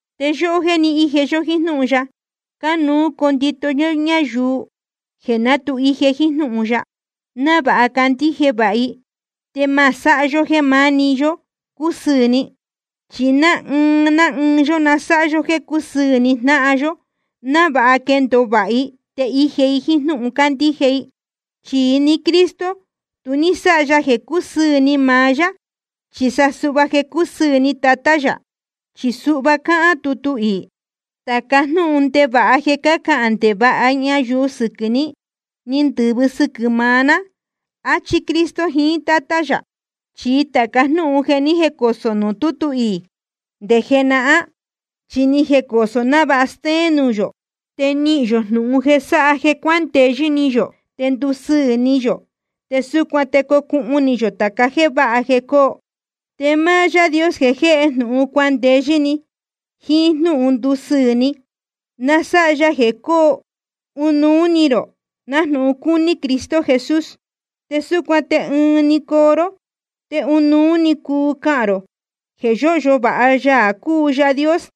Te yóhó jéē ni íje yó jíín jnúhun ya, cánuú condito yó ñáyuu jeē ná tu ije jíín jnúhun ya, návāha candíje vāha i. Te ma sáha yó jéē maá‑ni yó cusɨɨ̄ ni. Chi ná ɨɨn ná ɨɨn yó na sáha yó jéē cúsɨɨ̄ ni jnáhan yó, návāha quendōo vāha i te ije i jíín jnúhun cándíje i. Chi ni Cristo, tu ní sáha ya jeē cúsɨɨ̄ ni maá yá, chi sa suhva jeē cúsɨɨ̄ ni Tatá yā. Chi suhva cáhán tutu iī: Tāca jnúhun ndevāha jeē cácahān ndevāha ñayuu sɨquɨ̄ ní, ni ndɨ̄vɨ sɨquɨ̄ maá ná, áchí Cristo jiín Tátá yā. Chi tāca jnúhun jeē ni jécosō nuū tútu iī nde jenahán, chi ni jecosō návāha stéén nuū yō, te nihīn yō jnūhun jeē sáha jeē cuandeyɨ́ ni yō te ndusɨɨ̄ ni yō. Te súcuan te cocuhun ni yō tāca jéē váha jeē cóo. Te máá Yaā Dios jeē jéhe jnūhun cuandeyɨ́ ni jiín jnúhun ndúsɨɨ̄ ni, na sáha ya jeē cóo ɨnuú ni rō, nájnūhun cúní Cristo Jesús. Te súcuan te ɨɨn‑ni coo ró te ɨnuú‑ni cuu cahān rō jeē yóhyo vāha Yaā cúu Yaā Dios,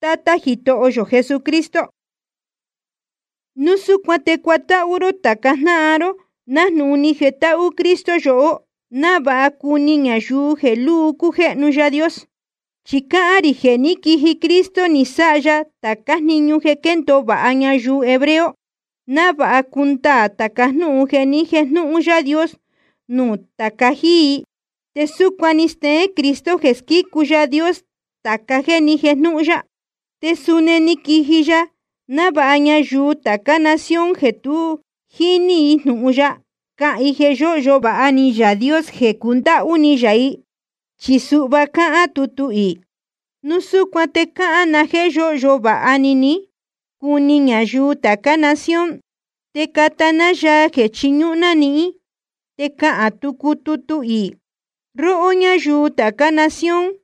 Tátá Jitoho yō Jesucristo. Núu súcuan te cuatáhú ró tāca jnáhan ró, nájnūhun ni jetáhú Cristo yohó, návāha cuni ñayuu jeē luu cújéhnu Yaā Dios. Chi cáhán rī jeē ní quiji Cristo Jesús, ni sáha ya tācá jniñu jeē quéndōo vāha ñayuu hebreo, návāha cundaā tāca jnúhun jeē ni jéjnūhun Yaā Dios nuū tāca jíí i. Te súcuan ni steén Cristo jeē squícu Yaā Dios tāca jéē ni jéjnūhun ya. Te suni ni quiji ya návāha ñayuu tācá nación jeē tu jíní jnūhun ya, cahān i jeē yóhyo vāha ni Yaā Dios jeē cundáhú ni yā i. Chi suhva cáhán tutu iī: Núu súcuan te cahān na jéē yóhyo vāha ni ní, cuni ñayuu tācá nación, te cata ná yaa jeē chiñúhún ná nihín. Te cáhán tucu tutu iī: Róhó ñáyuu tācá nación,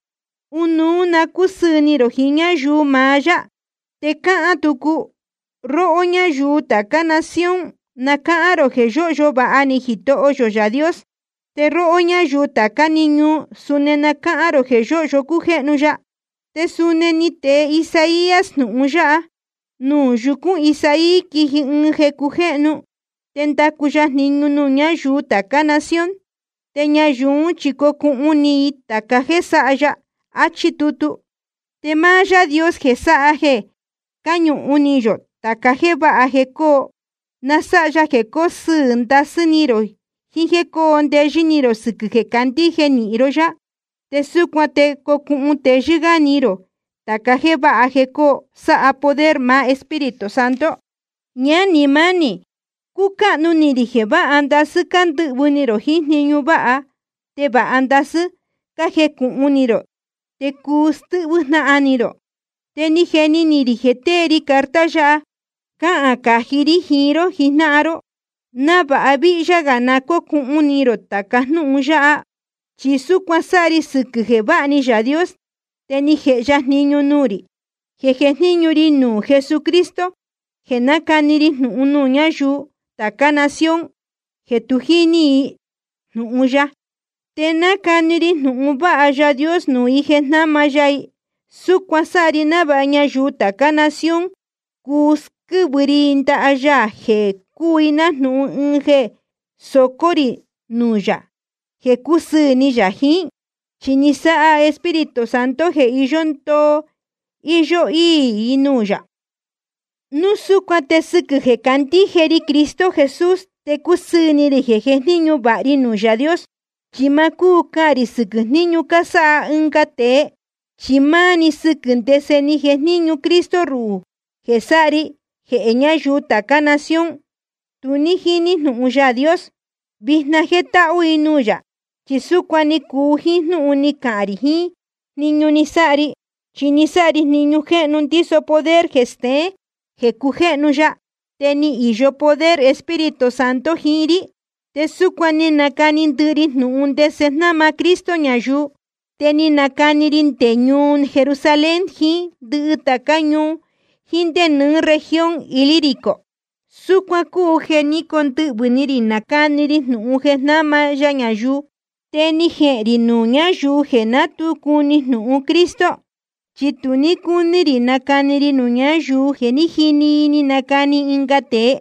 ɨnuú na cúsɨɨ̄ ni rō jiín ñáyuu maá yá. Te cáhán tucu: Róhó ñáyuu tācá nación, na cáhán rō jeē yóhyo vāha ni Jitoho yō Yaā Dios, te róhó ñáyuu tācá‑ni ñuu, suni na cáhán rō jeē yóhyo cújéhnu ya. Te suni ni tee Isaías jnūhun yáha: Nuū yúcūn Isaí quiji ɨɨn jeē cujéhnu, te ndacu ya jniñu nuū ñáyuu tācá nación. Te ñayuu ún chi cocuhun ni i tāca jéē sáha ya. Achí tutu. Te máá Yaā Dios jeē sáha jeē cáñuhun ni yō tāca jéē váha jeē coo, na sáha ya jeē cóo sɨɨ̄ ndasɨ́ ni rō jiín jéē cóo ndeyɨ́ ni rō sɨquɨ̄ jeē cácandíje nīhin ró yá. Te súcuan te cocuhun teyɨ́ gá ni rō tāca jéē váha jeē coo, sáha poder maá Espíritu Santo. Ñánī mánī, cúcáhnu ni rī jeē váha ndasɨ́ cándɨhvɨ̄ ni rō jiín jniñu váha, te vāha ndasɨ́ cájecūhun ni rō, te cúu stɨ́hvɨ́ jnáhan ni rō. Te ni jeni ni rī jeē tee ri carta yáha cáhān cají rí jiín ró jijnáhan ró, návāha víhyá gā na cócuhun ni rō tāca jnúhun yáha. Chi súcuan sáha ri sɨquɨ̄ jeē váha ni Yaā Dios te ni jēhe ya jniñu nuū rī jeē jejníñu ri nuū Jesucristo, jeē nácani ri jnūhun nuū ñáyuu tācá nación jeē tu jíní jnūhun ya. Te nácani ri jnūhun vāha Yaā Dios nuū i jeē jnáma ya i. Súcuan sáha ri návāha ñayuu tācá nación, cuu squɨ́vɨ ri i ndaha ya jeē cúu i nájnūhun ɨɨn jeē socó rī nuū yā jeē cúsɨɨ̄ ni yā jiín. Chi ni sáha Espíritu Santo jeē iyó ndoo íyó íī i nuū yā. Núu súcuan te sɨquɨ̄ jeē candíje ri Cristo Jesús, te cúsɨɨ̄ ni rī jeē jejníñu vāha ri nuū Yaā Dios. Chi ma cúu cahān rī sɨquɨ̄ jníñu cásáha ɨnga tēe, chi máá‑ni sɨquɨ̄ ndese ni jejníñu Cristo ruhū jeē sáha ri jeē ñáyuu tācá nación tu ní jíní jnūhun Yaā Dios, vijna jétáhú i nuū yā. Chi súcuan ni cuu jíín jnúhun ni cahān rī jiín jniñu ni sáha ri. Chi ni sáha ri jniñu jéhnu ndíso poder jeē steén jeē cujéhnu ya, te ni īyo poder Espíritu Santo jiín rí. Te súcuan ni nacani ndɨhɨ ri jnūhun ndese jnáma Cristo ñayuu. Te ni nacani ri nde ñuu Jerusalén, jíín ndɨhɨ tācá ñuu, jiín nde nɨɨ́ región Ilírico. Súcuan cúu jeē ní condɨhvɨ̄ ni rī ni nacani ri jnūhun jeē jnáma ya ñayuu. Te ni jehēn rī nuū ñáyuu jeē ná tu cuni jnūhun Cristo, chi tu ní cúní rī nacani ri nuū ñáyuu jeē jé ni jini i ni canacani ɨnga tēe.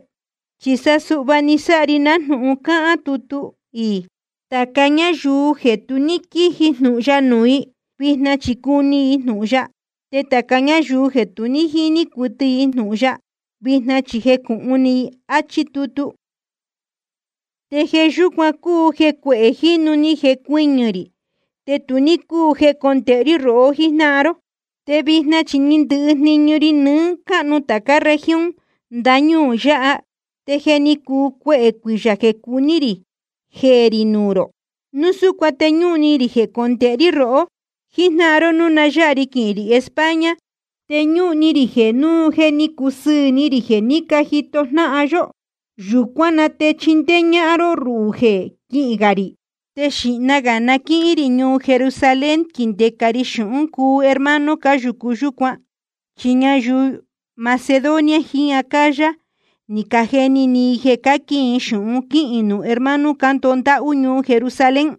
Chi sa suhva ni sáha ri nájnūhun cáhán tutu iī: Tāca ñáyuu jeē tu ní quíji jnūhun ya nuū i, vijna chi cuni i jnūhun ya, te tāca ñáyuu jeē tu ní jíní cuɨtɨ jnūhun ya, vijna chi jecūhun ni i. Achí tutu. Te jeē yúcuan cúu jeē cuehē jínu ni cujnéñu ri, te tu ní cúu jecondēhe rí rohó jíjnáhan ró. Te vijna chi ni ndɨhɨ jniñu ri nɨɨ́ cáhnu tācá región ndañúū yáha. Te je ni cuu cuehē cuiyā jeē cuní rī jeē rī nuū rō. Núu súcuan te ñúhun ni rī jecondēhe rí rohó jíjnáhan ró núu na yáha ri quihīn rī España. Te ñúhun ni rī jeē núu je ni cusɨɨ̄ ni rī jeē ní jito jnáhan yó, yūcuán na te chindéé ñáhán ró ruhū jeē quihín gā rī. Te xīhna gā na quíhín rī ñuu Jerusalén quindēca ri xūhún cuu hermano cáyūcu yúcuan. Chi ñayuu Macedonia jiín Acaya ni cajeni ni i jeē cáquin i xūhun quíhīn nuū hermano cándoho ndáhú ñuu Jerusalén.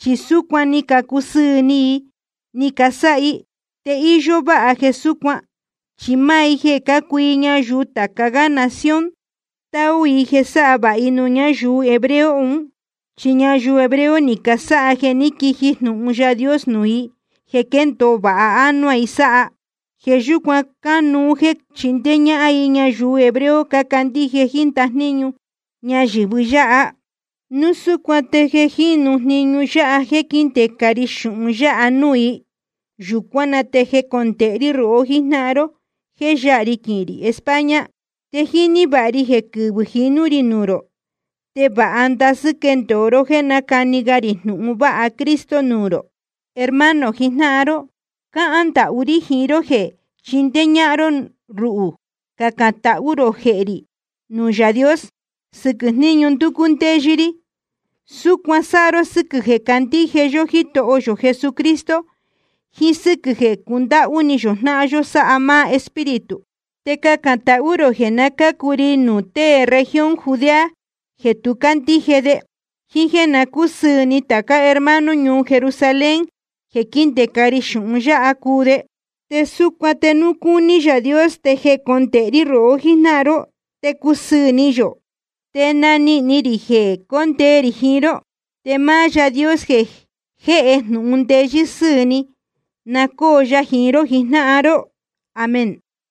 Chi súcuan ni cacusɨɨ̄ ni i ni casáha i. Te íyó váha jeē súcuan, chi máá i jeē cácuu i ñayuu tāca gá nación, táú i jeē sáha vāha i nuū ñáyuu hebreo un. Chi ñayuu hebreo ni casáha jeē ní quiji jnūhun Yaā Dios nuū i jeē quéndōo vāha ánuá i sáha. Jeē yúcuan cánuú jéē chindéé ñáhán i ñayuu hebreo cácandíje jíín ndajníñu ñayɨ̄vɨ yáha. Núu súcuan te jeē jínu jniñu yáha jéē quíndēca ri xūhun yáha nuū i, yūcuán na te jecondēhe rí rohó jíjnáhan ró jéē yáha ri quihīn rī España. Te jíní vāha ri jeē quɨvɨ̄ jinú rī nuū rō, te vāha ndasɨ́ quendōo ró jéē nacani ga rī jnūhun vāha Cristo nuū rō. Hermano jijnáhan ró, cáhán ndahú rí jiín ró jeē chindéé ñáhán ró ruhū cacān tahú rō jehē rī nuū Yaā Dios sɨquɨ̄ jníñu ndúcú ndéyɨ́ rí. Súcuan sáha ró sɨ́quɨ̄ jeē candíje yó Jítoho yō Jesucristo, jiín sɨ́quɨ̄ jeē cundáhú ni yō jnáhan yó sáha máá Espíritu. Te cacān tahú rō jeē na cácu ri nuū tée región Judea jeē tu cácandíje, jíín jéē na cúsɨɨ̄ ni tācá hermano ñuu Jerusalén jeē quíndēca ri xūhun yáha cuu de. Te súcuan te núu cúní Yaā Dios te jecondēhe rí rohó jíjnáhan ró, te cusɨɨ̄ ni yō, te nanihīn ni rī jeē condee rī jiín ró. Te máá Yaā Dios jeē jéhe jnūhun ndeyɨ́ sɨ́ɨ̄ ni, na cóo ya jiín ró jijnáhan ró. Amén.